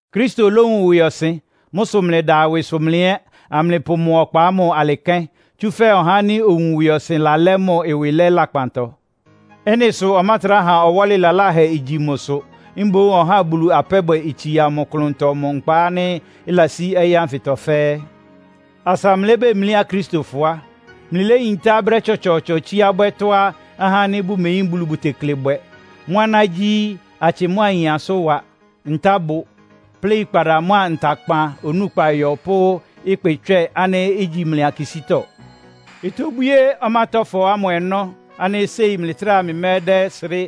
Kristo lówun ɩwɩɔsɩn. Mʋ́ sʋ mlɩda ɩwɩsʋ mlɩ ɛ́, amlɩpʋ mʋ ɔkpa ámʋ alɩ kɛ́n. Tsúfɛ́ ɔhá ánɩ́ owun ɩwɩɔsɩn lalɛ́ mʋ ɩwɩ lɛ́ lakpantɔ. Ɩ́nɩ sʋ ɔmátrá ha ɔwɔ́lɩ laláhɛ igyi mʋsʋ. Mboún ɔhá Bulu apɛ́bwɛ itsia mʋ klʋntɔ mʋ nkpa ánɩ́ ɩlasí ɔyɩ́ ánfɩtɔ fɛ́ɛ́. Asa mlɩlébemlí Akristofɔ á, mlɩléyintá brɛ́ tsɔtsɔɔtsɔ tsíá bwɛ́ tɔ́á ahá ánɩ́ bʋmeyín Bulu bʋtekle bwɛ. Mʋ́ aná gyí; atsɩ mʋ́a ayin asʋ́nwa, ntábʋ, pléikpada mʋ́a ntakpan onúkpa yɔ pʋ́ ɩkpɩtswɛ́ɛ ánɩ́ ígyi mlɩ akisítɔ. Itobwíé ɔmátɔ́fɔ ámʋ ɔnɔ́ ánɩ́ séi mlɩtráa mlɩmɛ́dɛ́srɩ́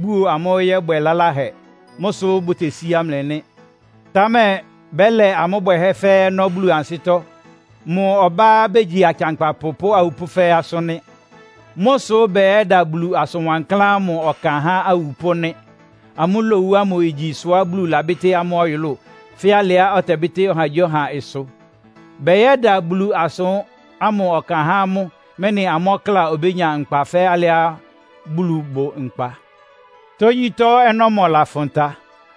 buo amʋ́ yɔ́bwɛ lalahɛ. Mʋ́ sʋ́ bʋtesíá mlɩ nɩ́. Támɛ bɛ́lɛ amʋ́ bwɛhɛ́ fɛ́ɛ́ ɔnɔ́ Bulu ansɩ́tɔ́. Mʋ ɔbá begyi akɩankpapʋ pʋ́ awupʋ́ fɛ́ɛ́ asʋ́n nɩ́. Mʋ́ sʋ́ bɛyɛ́da Bulu asʋ́n wankláán ámʋ ɔkan há awupʋ́ nɩ́. Amʋ́ lowu ámʋ igyi ɩsʋá Bulu labɩ́tɩ́ amʋ́ ɔyʋlʋ́ʋ, fɛ́ alɩá ɔtɛbɩ́tɩ́ ɔhagyíɔha ɩsʋ. Bɛyɛ́da Bulu asʋ́n ámʋ ɔkan há amʋ́, mɛ́nɩ amʋ́ ɔkláa obénya nkpa fɛ́ alɩá Bulu bʋ nkpa. Tógyítɔ́ ɔnɔ́mɔ lafʋn ta.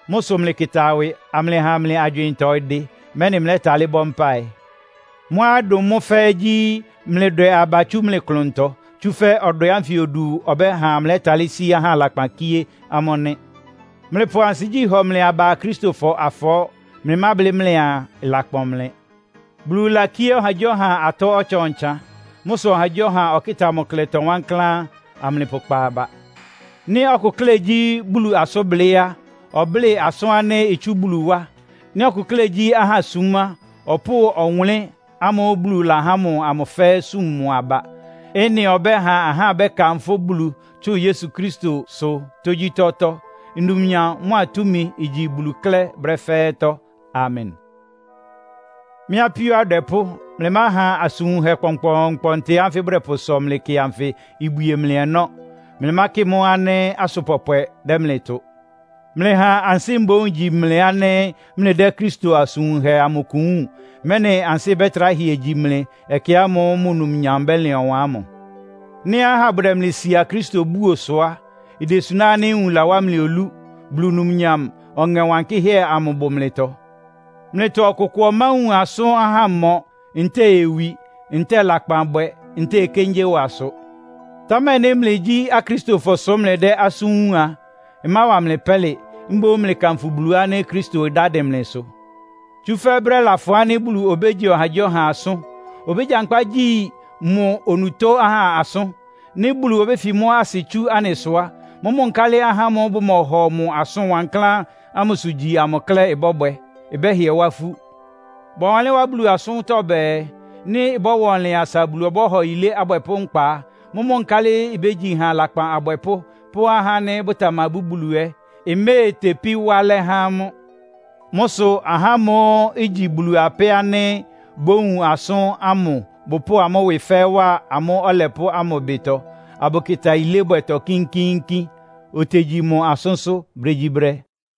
Mʋ́ sʋ mlɩkɩta ɩwɩ, amlɩha mlɩ agywɩɩntɔ ɩdɩ, mɛ́nɩ mlɛ́talɩ́ bɔ́ mpáɩ. Mʋ́á ɩdʋn mʋ́ fɛ́ɛ́ gyí, mlɩdwɛ aba tsu mlɩ klʋntɔ. Tsúfɛ́ ɔdwɛ ánfɩ odu ɔbɛ́ha mlɛ́talɩ́ sí ahá lakpan kíé amʋ́ nɩ́. Mlɩpʋ ansigyí hɔ mlɩ aba Akristofɔ afɔɔ́, mlɩmáblɩ́ mlɩaa ɩlakpɔn mlɩ. Bulu lakíé ɔhagyíɔha atɔ́ ɔtsan-ɔtsan. Mʋ́ sʋ ɔhagyíɔha ɔkɩ́ta mʋ klɛtɔ wankláán, amlɩpʋkpa aba. Nɩ́ ɔkʋ klɛ́ gyí Bulu asʋ́nblɩ́ á, ɔblɩ́ asʋ́n ánɩ́ itsú Bulu wá. Nɩ́ ɔkʋ klɛ́ gyí ahá súm á, ɔpʋ́ʋ ɔwʋnlɩ́n ámʋ́ʋ́ Bulu lahá mʋ amʋ fɛ́ɛ́ súm mʋ aba. Ɩ́nɩ ɔbɛ́ha ahá bɛ́kanfʋ́ Bulu tsʋn Yesu Kristosʋ tógyítɔ́tɔ́. Numnyam mʋ́a túmi igyi Bulu klɛ́ brɛ́ fɛ́ɛ́tɔ́. Amen. Mɩ́ apíó adwɛpʋ́, mlɩmáha asʋn wunhɛ kpɔnkpɔɔnkpɔntɩ ánfɩ bʋdɛpʋsɔ mlɩ kɩ anfɩ ibwie mlɩ ɔnɔ́. Mlɩmákɩ mʋ́ ánɩ́ asʋn pɔpwɛ dɛ́ mlɩ tʋ. Mlɩha ansɩ́ mboún igyi mlɩ ánɩ́ mlɩdɛ́ Kristo asʋn wunhɛ amʋ kʋ wúun, mɛ́nɩ ansɩ́ bɛtrá hɩɛ gyí mlɩ ɛkɛ ámʋ́ʋ́ mʋ numnyam bɛ́lɩn ɔwan ámʋ. Nɩ́ ahá bʋdɛ mlɩ sia Kristo búo sʋ á, idesuná ánɩ́ nwun lawá olú. Bulu Numnyam Ɔŋɛ Wankɩ́hɛ́ amʋ bʋ mlɩtɔ. Mlɩtɔ ɔkʋkʋ ɔmáwun asʋ́n ahámɔ, ntɛ́ɛ owi, ntɛ́ɛ lakpanbwɛ, ntɛ́ɛ okéngyéwa sʋ. Támɛ nɩ́ mlɩgyí Akristofɔ sʋ mlɩdɛ́ asʋ́n wúun a, ɩmáwa mlɩ pɛ́lɩ. Mboún mlɩkanfʋ Bulu ánɩ́ Kristo ɩdá dɩn mlɩsʋ. Tsúfɛ́ brɛ́ lafʋn ánɩ́ Bulu obégyi ɔhagyíɔha asʋ́n. Obégyankpá gyi mʋ onutó ahá asʋ́n. Nɩ́ Bulu obéfi mʋ́ asɩ tsú anɩsʋ á, mʋ́mʋ́ nkálɩ ahá ámʋ́ʋ́ bʋmɔhɔ mʋ asʋn wankláán ámʋsʋ gyi amʋ klɛ́ bɔ́bwɛ? Ɩbɛ́hɩɛ wá ifú. Bɔwanlɩ́n wá Bulu asʋ́ntɔ́ bɛɛ, “Nɩ́ ɩbɔ́wa ɔnlɩn asa Bulu ɔbɔ́hɔ yilé abwɛpʋ́ nkpa á, mʋ́mʋ́ nkálɩ ibégyi ha lakpan abwɛpʋ́ pʋ́ ahá ánɩ́ bʋtamabú Bulu ɛ́? Iméetepí wá alɛ́ há amʋ́.” Mʋ́ sʋ ahá ámʋ́ʋ́ igyi Bulu apɛ́ ánɩ́ bʋwúun asʋ́n ámʋ bʋpʋ́ʋ amʋ́ ɩwɩ fɛ́ɛ́ wa amʋ́ Ɔlɛpʋ́ ámʋ ɩbɩtɔ, abʋkɩta yilébwɛtɔ kínkíínkín. Otegyi mʋ asʋ́nsʋ́ brégyíbrɛ́.